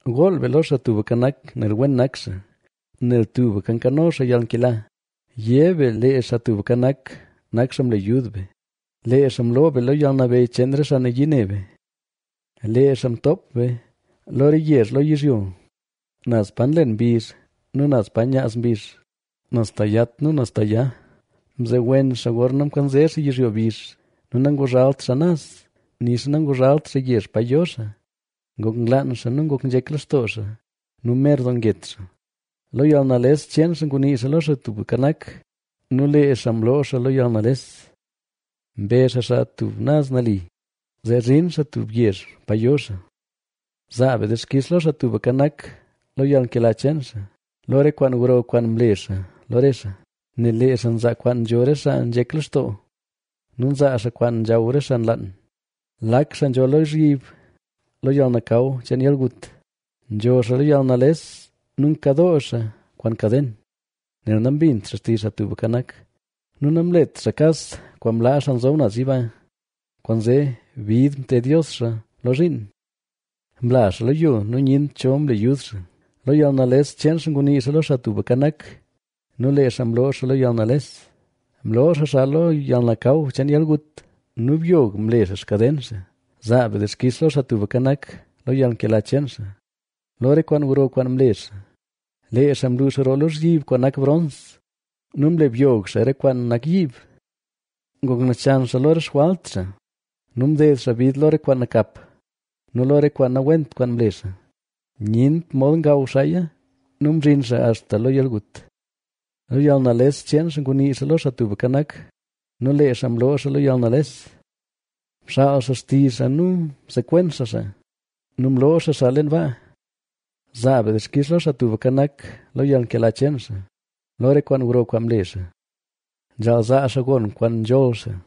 Gool be lo Xaa Tubka Nak, nel wen nak xaa, nel tubka nkano xaa yalnkela. Yé be lee Xaa Tubka Nak, nak xaa mle yud be, lee xaa mloo be lo yalnabeyy cheen re xaa nayii ne be. Lee xaa mtoop be lo re yezh lo yizhyo, naz pa nlen mbizh nu naz pa nyaaz mbizh, naz ta yat nu naz ta ya. Mzewen xaa gorna mkanze xaa yizhyo bizh nu nanguzhalt xaa naz, nixa nanguzhalt xaa yezh pa yo xaa. Ngok nlaan xaa nu ngok nzhek lextoo xaa nu mer doo nget xaa. Lo yalnales cheen xaa ngunii xaa lo Xaa Tubka Nak nu lee xaa mloo xaa lo yalnales. Mbe xaa xaa tub naz nali, zee zhin xaa tub yezh pa yo xaa. Zaa be dixkix lo Xaa Tubka Nak, lo yalnkela cheen xaa, lo re kwaan gro kwaan mle xaa lo re xaa, nel lee xaa nzaa kwaan nzho re xaa nzhek lextoo nu nzaa xaa kwaan nzhaw re xaa nlaan. Lak xaa nzho lozhyib lo yalnakaw cheen yalgut, nzho xaa lo yalnales nu nkadoo xaa kwaan kaden. Nel nambint xaa xtizh Xaa Tubka Nak nu namlet xaa kas kwaan mlaa Xaa Nzob Naz Yiba. Kwaanzee bid mted Dios xaa lo zhiin; mla xaa lo yo nu nyent cho mle yud xaa. Lo yalnales cheen xaa ngunii xaa lo Xaa Tubka Nak nu lee xaa mloo xaa lo yalnales, Mloo xaa xaa lo yalnakaw cheen yalgut nu byog mle xaa xkaden xaa. Zaa be dixkix lo Xaa Tubka Nak, lo yalnkela cheen xaa, lo re kwaan gro kwaan mle xaa, Lee xaa mluux roo lozhyib kwaan nak brons nu mle byog xaa re kwaan nak yiib. Ngok nachan xaa lo re xjwalt xaa nu mded xaa bid lo re kwaan nakap nu lo re kwaan nawent kwaan mle xaa. Nyent mod ngaw xaaya nu mzhin xaa axta lo yalgut. Lo yalnales cheen xaa ngunii xaa lo Xaa Tubka Nak nu lee xaa mloo xaa lo yalnales. Mxaal xaa xtizh xaa nu msekwen xaa xaa nu mloo xaa xaa leen baa. Zaa be dixkix lo Xaa Tubka Nak, lo yalnkela cheen xaa, lo re kwaan gro kwaan mle xaa. Nzhaal zaa xaa gon kwaan nzholl xaa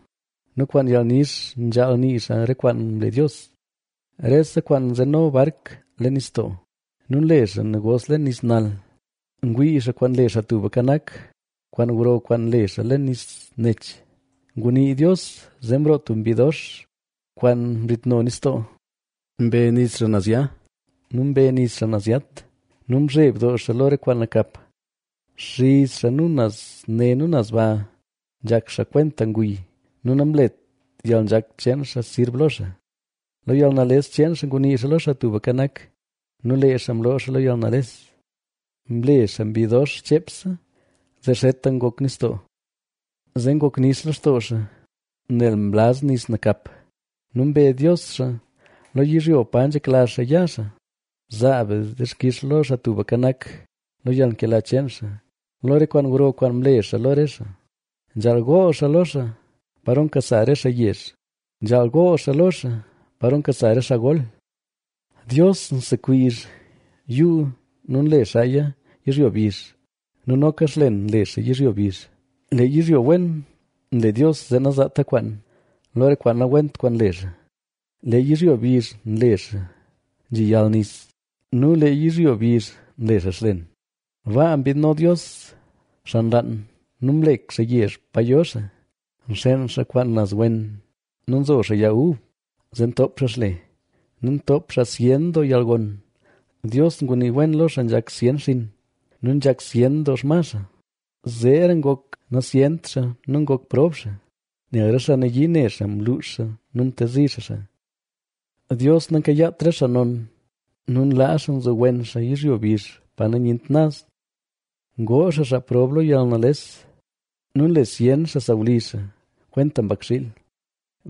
nu kwaan yalnix nzhaal nii xaa re kwaan mle Dios. Rese xaa nzeno bark leen nistoo nu nle xaa negos leen nis nal, ngwii xaa kwaan nle Xaa Tubka Nak, kwaan gro kwaan nle xaa leen nis nech. Ngunii Dios, zee mroo tub mbi dox, kwaan mzhitno nistoo. Mbe nis xaa naz ya nu mbe nis xaa naz yat nu mzheb doo xaa lo re kwaan nakap. Nxiz xaa nu naz ne naz ba nzhak xaa kwenta nguy nu namlet yalnzhak cheen xaa sirb lo xaa. Lo yalnales cheen xaa ngunii xaa lo Xaa Tubka Nak nu lee xaa mloo xaa lo yalnales. Mle xaa mbi dox cheepse, zee zheta ngok nistoo. Zee ngok nix lextoo xaa, nel mlaz nis nakap nu mbe Dios xaa lo yizhyo pa nzhekla xaa ya xaa. Zaa be dixkix lo Xaa Tubka Nak, lo yalnkela cheen xaa, lo re kwaan gro kwaan mle xaa lo re xaa. Nzhaal gool xaa lo xaa, paro nkasa re xaa yezh, nzhaal gool xaa lo xaa, paro nkasa re xaa gol. Dios nsekwiizh yuu nu nle xaaya yizhyo bizh nu noka xlen nle xaa yizhyo bizh. Lee yizhyo wen nle Dios zee nazaata kwaan, lo re kwaan nawent kwaan nle xaa. Lee yizhyo bizh nle xaa nzhi yal nis nu lee yizhyo bizh nle xaa xlen. Baa mbiidno Dios xaa nlaan nu mlek xaa yezh pa yo xaa. Nxeen xaa kwaan naz wen nu nzo xaa yag ub, zee ntoop xaa xle nu ntoop xaa zyen doo yalgon. Dios ngunii wen lo xaa nzhak zyen xinn nu nzhak zyen doo xma. Zeera ngok nazyent xaa nu ngok prob xaa, nel re xaa nayii ne xaa mluux xaa nu mtezi xaa xaa. Dios nankayaat re xaa non nu nlaa xaa nzowen xaa yizhyo bizh pa nyent naz. Ngoo xaa xaa prob lo yalnales nu nle zyen xaa sawlizh xaa, kwenta mbakxiil.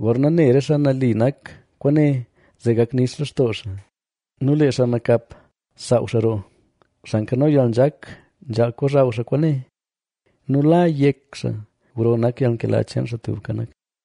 Gorna ne re xaa nali nak kwaane zee gak nix lextoo xaa nu lee xaa nakap saaw xaa roo. Xaa nkano yalnzhak, nzhaal kozhaw xaa kwaane nu la yek xaa gro nak yalnkela cheen Xaa Tubka Nak.